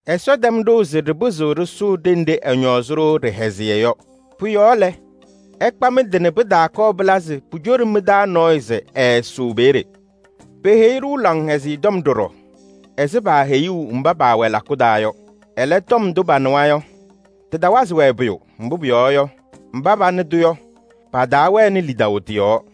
Ɛsɔ tɛm ɖʋʋ se ɖɩpɩzɩɣ ɖɩsʋʋ ɖenɖe ɛñɔɔzɩ-ɖʋ ɖɩhɛzɩyɛ yɔ. Pʋ-yɔɔ lɛ, ɩkpa mɩ-tɩ nɛ pɩtaakɔɔ pɩla se pucoɖi mɩ-taa nɔɔyʋ se ɛɛsʋʋ peeye. Peheyi-ɖʋ Laŋhɛzɩyɛ Tɔm ɖɔɖɔ ɛzɩ paaheyuu mba paawɛ lakʋ taa yɔ. Ɛlɛ, tɔm ndʋ panɩwa yɔ, tɩtawazɩ-wɛ pʋyʋ, mbʋ pʋyɔɔ yɔ, mba panɩ-tʋ yɔ, pataawɛnɩ lidaʋ tɩ-yɔɔ.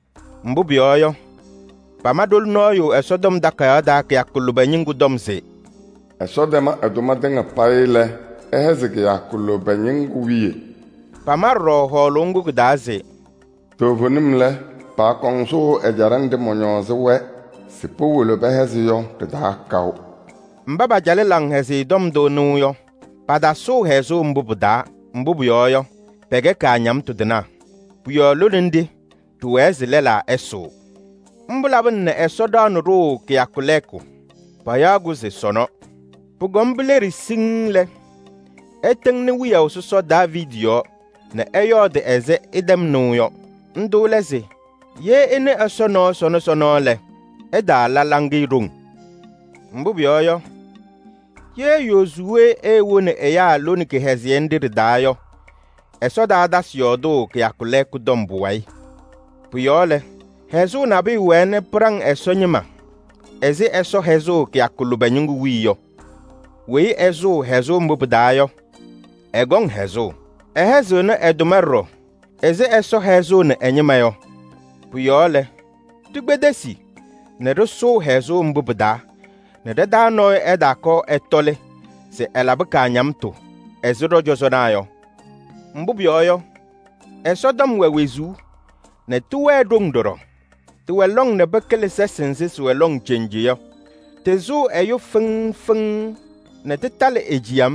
Mbʋ pʋyɔɔ yɔ, pama ɖoli nɔɔyʋ Ɛsɔtɔm Takayaɣ taa kɩyakʋ lʋbɛ ñɩŋgʋ tɔm se: “Ɛsɔ tɛm ɛ-tʋma tɩŋa payɩ lɛ, ɛhɛzɩ kɩyakʋ lʋbɛ ñɩŋgʋ wiye.” Pama ɖɔɖɔ hɔɔlʋʋ ŋgʋ kɩ-taa se: “Toovenim lɛ, paakɔŋ sʋʋ ɛjaɖɛ nɖɩ mɔñɔɔzɩ-wɛ se powolo pɛhɛzɩ yɔ ɖɩ-taa kaʋ.” Mba pacalɩ Laŋhɛzɩyɛ Tɔm ndʋ nɩʋ yɔ, patasʋʋ hɛzʋʋ mbʋ pɩ-taa, mbʋ pʋyɔɔ yɔ, pɛkɛ kaañamtʋ tɩnaa. Pʋ-yɔɔ lone nɖɩ ɖɩwɛɛ se lɛlaa ɛsʋʋ. Mbʋ labɩna nɛ Ɛsɔ ɖaɣnɩ ɖʋʋ kɩyakʋ lɛɛkʋ. Payaɣ-kʋ se: “Sɔnɔ.” Pʋkɔm pileɖi siŋŋ lɛ, ɛtɩŋnɩ wiyaʋ sɔsɔ Daaviidi yɔɔ nɛ ɛyɔɔdɩ ɛzɩ ɩtɛm nɩʋ yɔ. Ndʋ lɛ se: “Ye ɩnɩ Ɛsɔ nɔɔ sɔnɔ sɔnɔ lɛ, ɩtaala hɔyɛ ɖoŋ.” Mbʋ pʋyɔɔ yɔ, ye Yozuwee eewoni ɛyaa lone kɩhɛzɩyɛ nɖɩ ɖɩ-taa yɔ, Ɛsɔ taatasɩ yɔɔdʋʋ kɩyakʋ lɛɛkʋ tɔm pʋwayɩ. Pʋ-yɔɔ lɛ, hɛzʋʋ nabʋyʋ wɛɛ nɛ pɩɖaŋ Ɛsɔ ñɩma ɛzɩ Ɛsɔ hɛzʋʋ kɩyakʋ lʋbɛ ñɩŋgʋ wiye yɔ. Weyi ɛsʋʋ hɛzʋʋ mbʋ pɩ-taa yɔ, ɛkɔŋ hɛzʋʋ. Ɛhɛzɩɣnɩ ɛ-tʋma ɖɔɖɔ ɛzɩ Ɛsɔ hɛzʋʋnɩ ɛ-ñɩma yɔ. Pʋ-yɔɔ lɛ, ɖikpedesi nɛ ɖɩsʋʋ hɛzʋʋ mbʋ pɩ-taa nɛ ɖa-taa nɔɔyʋ ɛtaakɔɔ ɛtɔlɩ se ɛlabɩ kaañamtʋ ɛzɩ ɖɔ-cɔzɔnaa yɔ. Mbʋ pʋyɔɔ yɔ, Ɛsɔtɔm wɛ wezuu nɛ tɩwɛɛ ɖoŋ ɖɔɖɔ. Tɩwɛ lɔŋ nɛ pɩkɩlɩ sɛsɩ nzɩ sɩwɛ lɔŋ cenje yɔ. Tɩsʋʋ ɛyʋ fɩŋ fɩŋ nɛ tɩtalɩ e-ciyam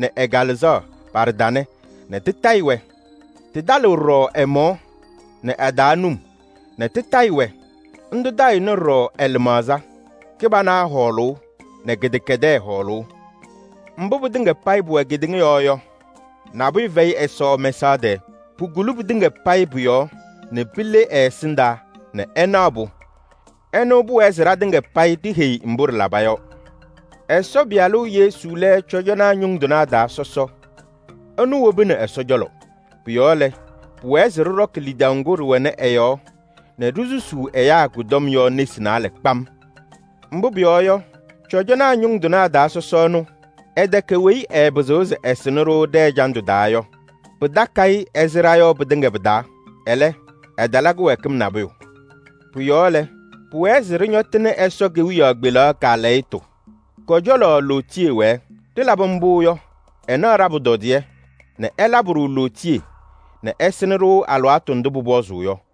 nɛ ɛ-kalɩzaɣ pa-ɖɩtanɛ nɛ tɩtayɩ-wɛ. Tɩtalɩɣ ɖɔɖɔ ɛ-mɔɔ nɛ a-taa num nɛ tɩtayɩ-wɛ. Ndʋ tayɩɣnɩ ɖɔɖɔ ɛ-lɩmaɣza: kɩbana hɔɔlʋʋ nɛ kɩdɛkɛdɛɛ hɔɔlʋʋ. Mbʋ pɩtɩŋa payɩ pʋwɛ kedeŋa yɔɔ yɔ, nabʋyʋ fɛyɩ Ɛsɔ mɛsaɣ tɛɛ. Pukuli pɩtɩŋa payɩ pʋ-yɔɔ nɛ pile ɛ-ɛsɩndaa nɛ ɛnaɣ-pʋ. Ɛnʋ pʋwɛɛ se ɖatɩŋa payɩ ɖiheyi mbʋ ɖɩlaba yɔ. Ɛsɔ Pɩyalʋ Yesu lɛ cɔjɔnaa ñʋŋ tɩnaa taa sɔsɔ, ɛnʋ wobini Ɛsɔ cɔlɔ. Pʋ-yɔɔ lɛ, pʋwɛɛ se ɖɩɖɔkɩ lidaʋ ŋgʋ ɖɩwɛnɩ ɛ-yɔɔ nɛ ɖisusuu ɛyaa kʋ-tɔm yɔ nesi naalɛ kpam. Mbʋ pʋyɔɔ yɔ, cɔjɔnaa ñʋŋ tɩnaa taa sɔsɔ ɛnʋ, ɛtɛkɛ weyi ɛɛpɩzɩɣ se ɛsɩnɩ-ɖʋ ɖɛ-ɛjandʋ taa yɔ: pɩtakɩ-ɩ ɛzɩ ɖa yɔ pɩtɩŋa pɩ-taa. Ɛlɛ, ɛtala kɩwɛɛkɩm nabʋyʋ. Pʋ-yɔɔ lɛ, pʋwɛɛ se ɖɩñɔtɩnɩ Ɛsɔ kewiyaɣ kpelaɣ kaalɛyɩtʋ, kɔ-cɔlɔ lootiye wɛɛ. Ɖɩlabɩ mbʋ yɔ, ɛnaɣ ɖa-pʋtɔdɩyɛ nɛ ɛlabɩ-ɖʋ lootiye nɛ ɛsɩnɩ-ɖʋ alɩwaatʋ ndʋ pʋpɔzʋʋ yɔ.